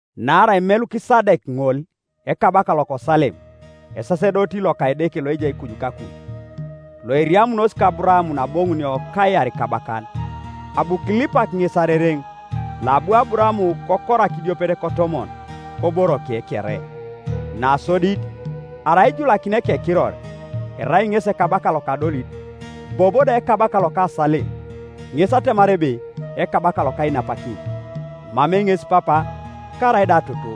Naarai Melukisadek ŋol, ekabaka loko Salem, esasedoti loka Edeke Loejai kuju kakuj, loeriamunos ka Aburaam naaboŋunio kajar ikabakan, abu kilipak ŋes arereŋ; loabu Aburaam kokorak idiopet kotomon koboroke kere. Nasodit, arai ijulakini ekekiror, erai ŋesi ekabaka loka adolit, bobo da ekabaka loka Salem, ŋes atemar ebe ekabaka loka ainapakin. Emamei ŋes papa, karaida toto,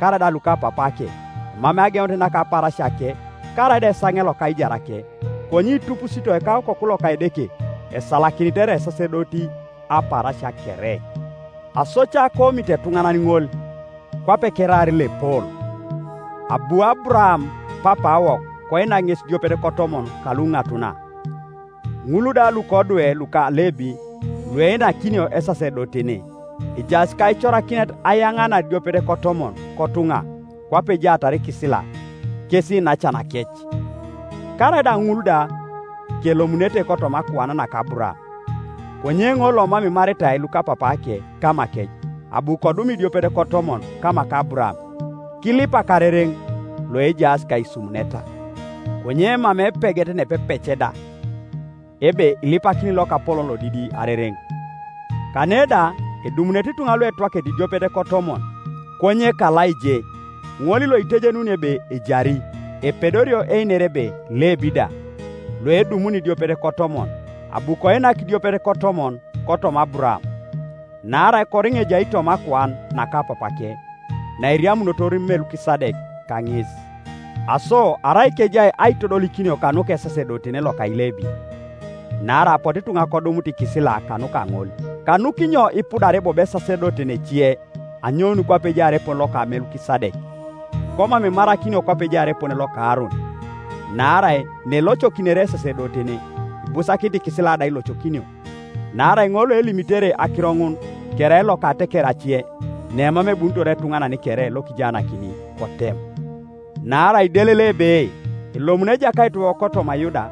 karaida lukapapaake, emamei ageunet naka apaarasiake, karaida esaŋe loka aijarake, konye itupusitoi ka Okoku loka Edeke, esalakinit erai esasedoti apaarasia kere. Aso ca koomito etuŋanan ŋol, kwape keraar loepol! Abu Aburaam papaawok koinak ŋes idiopet kotomon kaluŋatuna. Ŋul da lukodwe luka Lebi lueinakinio esasedotene ejaas kaicorakinet ayaŋanar idiopet kotomon kotuŋa kwape ejaatar ikisila, kes iinacanakec, karaida ŋul da kelomunete kotoma akuan naka Aburaam. Konye ŋol lomam imaritai lukapapaake kamakec, abu kodum idiopet kotomon kama ka Aburaam, kilipak arereŋ loejaas kaisumuneta. Konye emamei epeget nepepec da, ebe, ŋipakini lokapolon lodidi arereŋ. Kane da edumunete ituŋa luetwakete idiopet kotomon, konye kalaije, ŋol loiteienunio ebe ejari, Epedorio einer ebe Lebi da, loedumuni idiopet kotomon, abu koinak idiopet kotomon kotoma Aburaam, naarai koriŋa ejai toma akuan naka papaake naeriamunotor Melukisadek kaŋes. Aso arai kejai aitodolikinio kanuka esasedotene loka Ilebin, (naarai apotu ituŋa kodumut ikisila kanuka ŋol,) kanukinyo ipudare bobo esasedoti ece anyoun kwape ejaar epone loka Melukisadek, komam imarakinio kwape ejaar epone loka Aaron? Naarai naelocokinere esasedotene, ibusakinit ikisila da ailoeokinio. Naarai ŋol loalimitere akiro ŋun kerai loka ateker ace, nemam ebunitor etuŋanan kere lokijaanakini kotem. Naarai idelelei ebe elomunit Ejakaitiwok kotoma Yuda,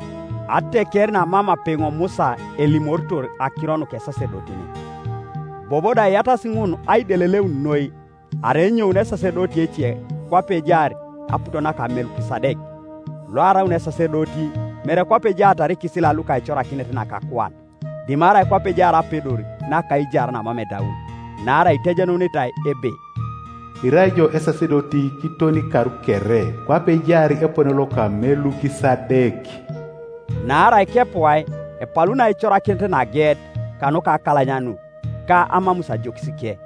ateker namam apeŋo Musa elimitor akiro nuka esasedotene. Bobo da iyatasi ŋun aideleleun noi, arai enyounit esasedoti ece kwape ejaar aput naka Melukisadek, loaraun esasedoti, mere kwape ejaatar ikisila luka aicorakinet naka akuan, dimarai kwape ejaar apedor naka aijar namam edaun. Naarai itejenunitai ebe, “Irai ijo esasedoti kiton ikar kere, Kwape ejaar epone loka Melukisadek.” Naarai kepuai epaluni aicorakinet nageet kanuka akalanyanut ka amamus ajokisike,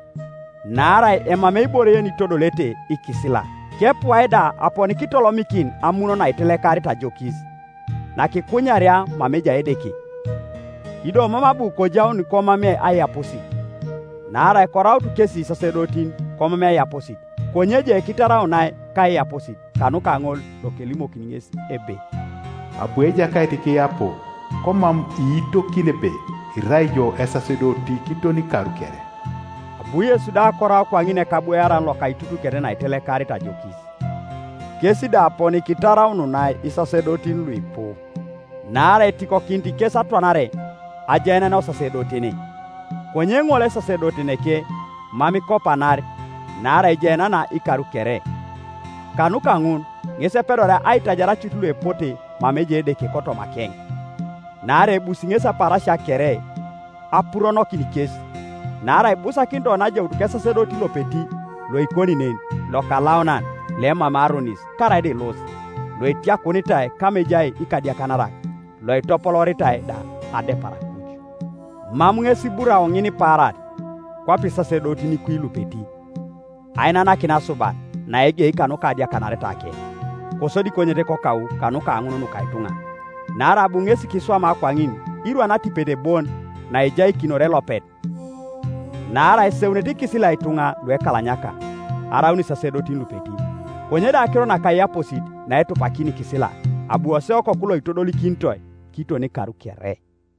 (naarai emamei ibore yenitodolete ikisila;) kepuai da aponi kitolomikin amun naitelekarit ajokis, nakikunyaria mama ejai Edeke. Ido mam abu kojau komamei aiyaposit. Naarai koraut kesi isasedotin komamei aiyaposit, konye je kitaraunai kaiyaposit kanuka ŋol lokelimokini ŋes ebe, “Abu Ejakait kiyapo, komam iitokini ebe, ‘Irai ijo esasedoti kiton ikar kere.’” Abu Yesu da korau kwaŋin ekabwoaran loka aitutuket naitelekarit ajokis. Kes da aponi kitaraununai isasedotin luipu, naarai etikokinit kes atwanare ajaenena osasedotene; konye ŋol, esasedoteneke mam ikopanar, naarai ejaenena ikar kere. Kanuka ŋun ŋes epedoria aitajar cut luepote mama ejai Edeke kotomakeŋ, naarai ebusi ŋesi apaarasia kere apuronokin kes. Naarai ibusakinit oni ajaut kesasedoti lopeti loikoni nen, lokalaunan, loemamei aronis, karaida elos, loetiakunitai kama ejaas ikadiakanarak, loitopolooritai da adepar akuj. Mam ŋes iburao ŋinipaaran, kwape isasedotin kwi lupeti, ainanakin asuban, naegei kanuka adiakanaretake, kosodi konyet kokau kanuka ŋun nuka ituŋa; naarai abu ŋesi kiswama, kwaŋin irwan atipet bon naejaikinor elopet. Naarai eseunete ikisila ituŋa luekalanyaka, araun isasedotin lupeti; konye do akirot naka aiyaposit naetupakini ikisila, abu koseu Okoku loitodolikinitoi kiton ikar kere.